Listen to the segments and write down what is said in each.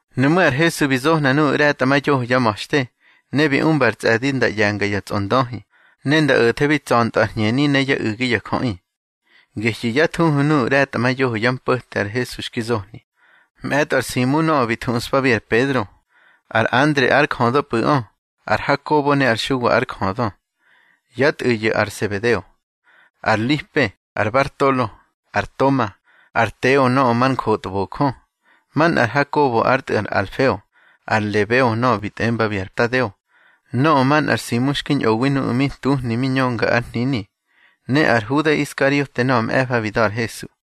Nuꞌmú̱ ar Hesu bi zohna nuꞌu̱ ꞌre̱tꞌamayoho yá ma̱xte, ne bi umba ar tsꞌe̱di nda ꞌye̱nga ya tsꞌondöhi, ne nda o̱thebi tsa̱ntꞌö yá hñeni ne yá u̱gi ya jöꞌi. Gehyu̱ yá thuhu nuꞌu̱ ꞌre̱tꞌamayoho yá mpo̱te ar Hesu xki zohni: Mꞌe̱tꞌo ar Simu nöꞌö bi thuꞌspabi ar Pedro, ar Andre ár jödöpꞌu̱ꞌö, ar Hakobo ne ar Xuwa ár jödö, yá tꞌu̱yu̱ ar Sebedeo. Ar Lipe, ar Bartolo, ar Toma, ar Teo nöꞌö mar njotbojö, manꞌar Hakobo ár tꞌu̱ ar Alfeo, ar Lebeo nöꞌö bi tꞌembabi ar Tadeo. Nöꞌö manꞌar Simu xki ñꞌowi nuꞌu̱ mi ntuhni mi ñönga ár hnini, ne ar Huda Iskariote nöꞌö mꞌe̱fa bi da̱ ar Hesu.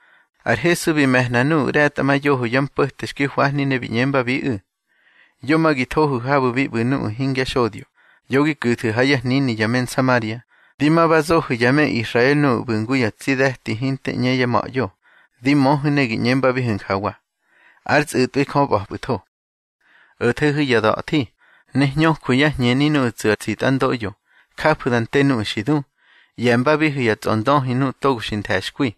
Ar Hesu bi me̱hna nuꞌu̱ ꞌre̱tꞌamayoho yá mpo̱te xki hwahni ne bi ꞌñembabiꞌu̱: —Yo ma gi thohu̱ habu̱ bi ꞌbu̱ nuꞌu̱ hingya xodyo. Yo gi ku̱thu̱ ha yá hnini ya me Nsamaria. Di ma ba zohu̱ ya me Israel nuꞌu̱ ꞌbu̱ ngu ya tsi de̱ti hinte ꞌñe yá ma̱ꞌyo. Di möhu̱ ne gi ꞌñembabihu̱ njawa: Ár tsꞌu̱tꞌwi Jö ꞌba̱pꞌu̱tho. O̱thehu̱ ya da̱thi, ne hñöjwu̱ yá hñeni nuꞌu̱ tsu̱ ar tsitꞌandoꞌyo, jafu̱ da nte nuꞌu̱ xi du, ꞌye̱mbabihu̱ ya tsꞌondöhi nuꞌu̱ togo xi nthe̱xkwi.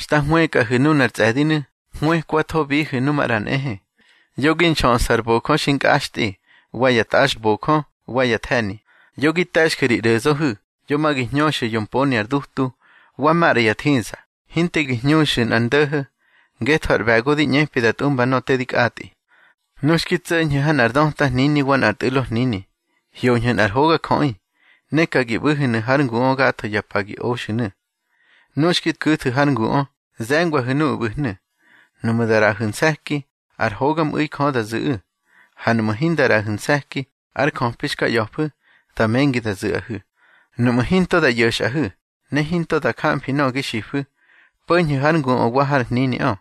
Xta hwëkꞌahu̱ nunar tsꞌe̱dinu̱, hwëkwathobihu̱ nu maꞌra nꞌehe. Yo gi nxöꞌsu̱ ar bojö xi nkꞌaxtꞌi, wa ya tꞌaxbojö, wa ya the̱ni. Yo gi te̱xju̱ ri ꞌro̱zöhu̱, yo ma gi hñöxu̱ yo mponi ar dutu, wa maꞌra ya thiza, hinte gi hñöxu̱ nꞌar ndo̱ho̱. Ngetho ar ꞌbe̱go di ꞌñepi da tꞌumba nöꞌö te kꞌatꞌi. Nu xki tso̱ñhu̱ ha nꞌar döta hnini wa nꞌar tꞌu̱lo hnini, hyoñhu̱ nꞌar hogajöꞌi, ne ka gi ꞌbu̱hu̱nu̱ hár nguꞌö gatho ya pa gi oxu̱nu̱. Nu xki ku̱thu̱ har nguꞌö, ze̱ngwahu̱ nuꞌu̱ ꞌbu̱hnu̱. Nuꞌmu̱ da ꞌraꞌahu̱ nse̱ki, ár hogamꞌu̱i Jö da zu̱ꞌu̱. Ha nuꞌmu̱ hinda ꞌraꞌahu̱ nse̱ki, ar njöpi xka ꞌya̱fu̱, da mengi da zu̱ꞌahu̱. Nuꞌmu̱ hinto da ꞌyo̱xꞌahu̱, ne hinto da jamfi nöꞌö gi xifu̱, po̱ñhu̱ har nguꞌö wa har hniniꞌö,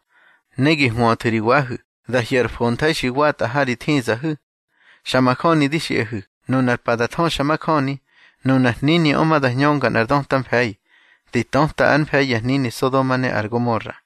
ne gi hwöthu̱ ri wahu̱, da hyo̱ ar fontha̱i xi watꞌa ha ri thizahu̱. Xa majöni di xiꞌahu̱, nunar pa da thöxamajöni, nunar hniniꞌö ma da hñönga nꞌar döta mfe̱i, di töta ár mfe̱i ya hnini Sodoma ne ar Gomora.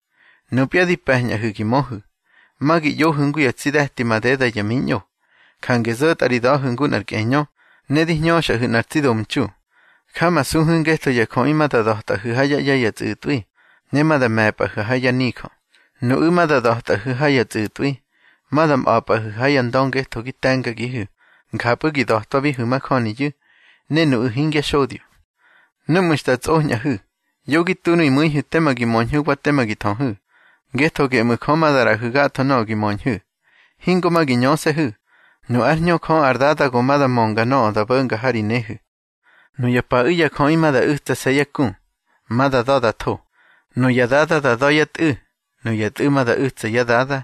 Nupya di pe̱ñꞌahu̱ gi möhu̱, ma gi ꞌyohu̱ ngu ya tsi de̱ti madeda ya miñꞌo. Jange zo̱tꞌa ri da̱hu̱ ngu nꞌar kꞌeñö, ne di hñöxꞌahu̱ nꞌar tsi domtxu. Jamasuhu̱ ngetho ya jöꞌi ma da da̱tꞌahu̱ ha yá ꞌye̱ ya tsꞌu̱tꞌwi, ne ma da me̱pꞌahu̱ ha yá nijö. Nuꞌu̱ ma da da̱tꞌahu̱ ha ya tsꞌu̱tꞌwi, ma da mꞌa̱pꞌahu̱ ha ya ndö ngetho gi te̱ngagihu̱. Njapꞌu̱ gi da̱twabihu̱ majöniyu̱, ne nuꞌu̱ hingya xodyo. Núꞌmu̱ xta tsꞌoñꞌahu̱, yo gi tu ri mu̱ihu̱ tema gi möñhu̱ wa tema gi thöhu̱, ngetho geꞌmu̱ Jö ma da ꞌraꞌahu̱ gatho nöꞌö gi möñhu̱. Hingo ma gi ñöse̱hu̱; nu ár Hñö Jö ar Dada go ma da mönga nöꞌö da bo̱nga ha ri nehu̱. Nuya paꞌu̱ ya jöꞌi ma da u̱tsase̱ yá ku, ma da da̱ da tho. Nuya dada da da̱ yá tꞌu̱, nuya tꞌu̱ ma da u̱tsa yá dada,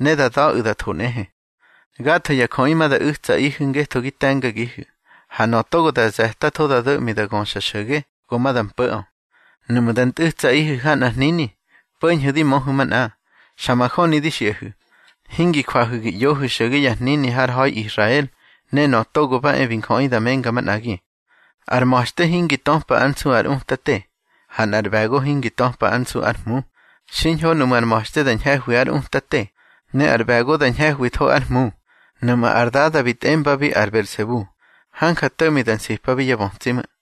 ne da da̱ꞌu̱ da tho nꞌehe. Gatho ya jöꞌi ma da u̱tsaꞌihu̱ ngetho gi te̱ngagihu̱, ha nöꞌö togo da ze̱tatho da do̱ꞌmi da göxa xo̱ge, go ma da mpo̱ꞌö. Nuꞌmu̱ da ntꞌu̱tsaꞌihu̱ ha nꞌar hnini, po̱ñhu̱ di möhu̱ manꞌa. Xa majöni di xiꞌahu̱, hingi jwahu̱ gi ꞌyohu̱ xo̱ge ya hnini har ha̱i Israel, ne Nöꞌö Togo ba e bi Njöꞌi da menga manꞌagi. Ar ma̱xte hingi töpa ár nsu ár utate, ha nꞌar ꞌbe̱go hingi töpa ár nsu ár hmu. Xiñho nuꞌmu̱ ar ma̱xte da ñhe̱hwi ár utate, ne ar ꞌbe̱go da ñhe̱hwitho ár hmu. Nuꞌmu̱ ar dada bi tꞌembabi ar Belsebu, hanja to̱ꞌmi da nsipabi yá bötsi ꞌmu̱.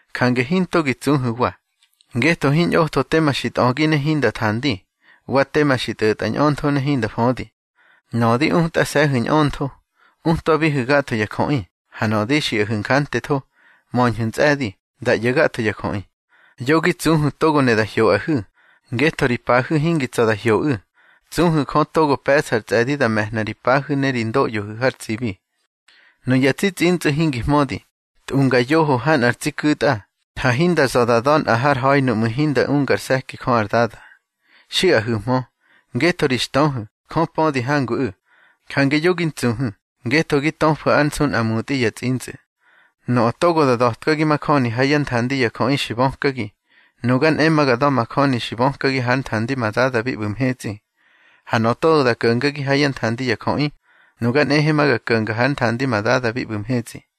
Jange hinto gi tsuhu̱wa, ngetho hiñꞌotho tema xi tꞌögi ne hinda thandi, wa tema xi tꞌo̱tꞌa ñꞌöntho ne hinda födi. Nöꞌö di utꞌase̱hu̱ ñꞌöntho, utwabihu̱ gatho ya jöꞌi, ha nöꞌö di xiꞌahu̱ njantetho, möñhu̱ ntsꞌe̱di, da ꞌyo̱ gatho ya jöꞌi. Yo gi tsuhu̱ togo ne da hyoꞌahu̱, ngetho ri pahu̱ hingi tsa̱ da hyoꞌu̱. Tsuhu̱ Jö togo pe̱ꞌsa ar tsꞌe̱di da me̱hna ri pahu̱ ne ri ndoꞌyohu̱ har tsibi. Nuya tsi tsꞌintsꞌu̱ hingi hmödi, tꞌunga yoho ha nꞌar tsi ku̱tꞌa, ha hinda za̱ da da̱ nꞌa har ha̱i nuꞌmu̱ hinda ungar se̱ki Jö ar Dada. Xiꞌahu̱hmö. Ngetho ri xtöhu̱, Jö pödi hanguꞌu̱. Jange yo gi ntsuhu̱, ngetho gi töfu̱ ár nsu nꞌa mutꞌi ya tsꞌintsꞌu̱. Nöꞌö togo da da̱tkagi majöni ha yá nthandi ya jöꞌi xi bökagi, nuga nꞌe ma ga da̱majöni xi bökagi hár nthandi ma Dada bi ꞌbu̱ mhetsꞌi. Ha nöꞌö togo da ko̱ngagi ha yá nthandi ya jöꞌi, nuga nꞌehe ma ga ko̱nga hár nthandi ma Dada bi ꞌbu̱ mhetsꞌi.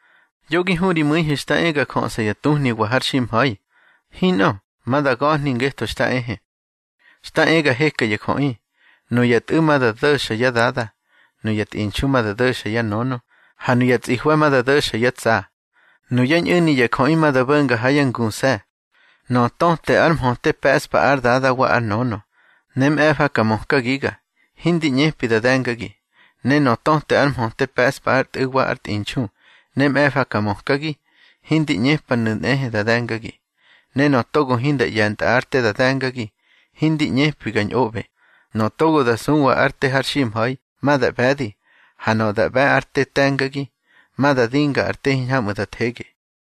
Yo gi hu ri mu̱ihu̱ xta e ga jöꞌsa ya tuhniwa har ximha̱i. Hinꞌö, ma da ga̱hni ngetho xta ehe. Xta e ga heka ya jöꞌi: nuya tꞌu̱ ma da do̱xa yá dada, nuya tꞌinxu ma da do̱xa yá nönö, ha nuya tsꞌihwe̱ ma da do̱xa yá tsa. Nuyá ñꞌu̱ni ya jöꞌi ma da bo̱nga ha yá nguse̱. Nöꞌö töte ár mhöte pe̱ꞌspa ár dada wa ár nönö, ne mꞌe̱fa ka mökagiga, hindi ꞌñepi da de̱ngagi. Ne nöꞌö töte ár mhöte pe̱ꞌspa ár tꞌu̱ wa ár tꞌinxu, ne mꞌe̱fa ka mökagi, hindi ꞌñepanu̱ nꞌehe da de̱ngagi. Ne nöꞌö togo hinda ꞌye̱ntꞌa ár te da de̱ngagi, hindi ꞌñepi ga ñꞌoꞌbe. Nöꞌö togo xa suwa ár te har ximha̱i, ma da ꞌbe̱di. Ha nöꞌö da ꞌbe̱ ár te te̱ngagi, ma da dinga ár te hiñhamꞌu̱ da thege.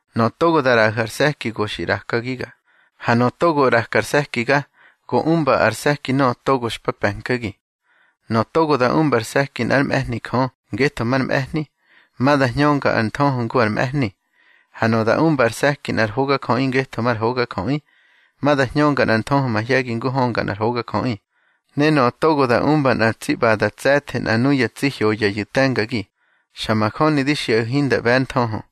Nöꞌö togo da ꞌraꞌahu̱ ar se̱ki go xi ꞌrakagiga, ha nöꞌö togo ꞌraka ar se̱kiga go umba ar se̱ki nöꞌö togo xpa pe̱nkagi. Nöꞌö togo da umba ar se̱ki nꞌár mꞌe̱hni Jö ngetho mar mꞌe̱hni, ma da hñönga ar nthöhö ngu ar mꞌe̱hni. Ha nöꞌö da umba ar se̱ki nꞌar hogajöꞌi ngetho mar hogajöꞌi, ma da hñönga nꞌar nthöhö mahye̱gi ngu hönga nꞌar hogajöꞌi. Ne nöꞌö togo da umba nꞌa tsi ꞌbada ar tse̱the nꞌa nuya tsi hyoyayu̱ te̱ngagi, xa majöni di xiꞌahu̱ hinda ꞌbe̱ ár nthöhö.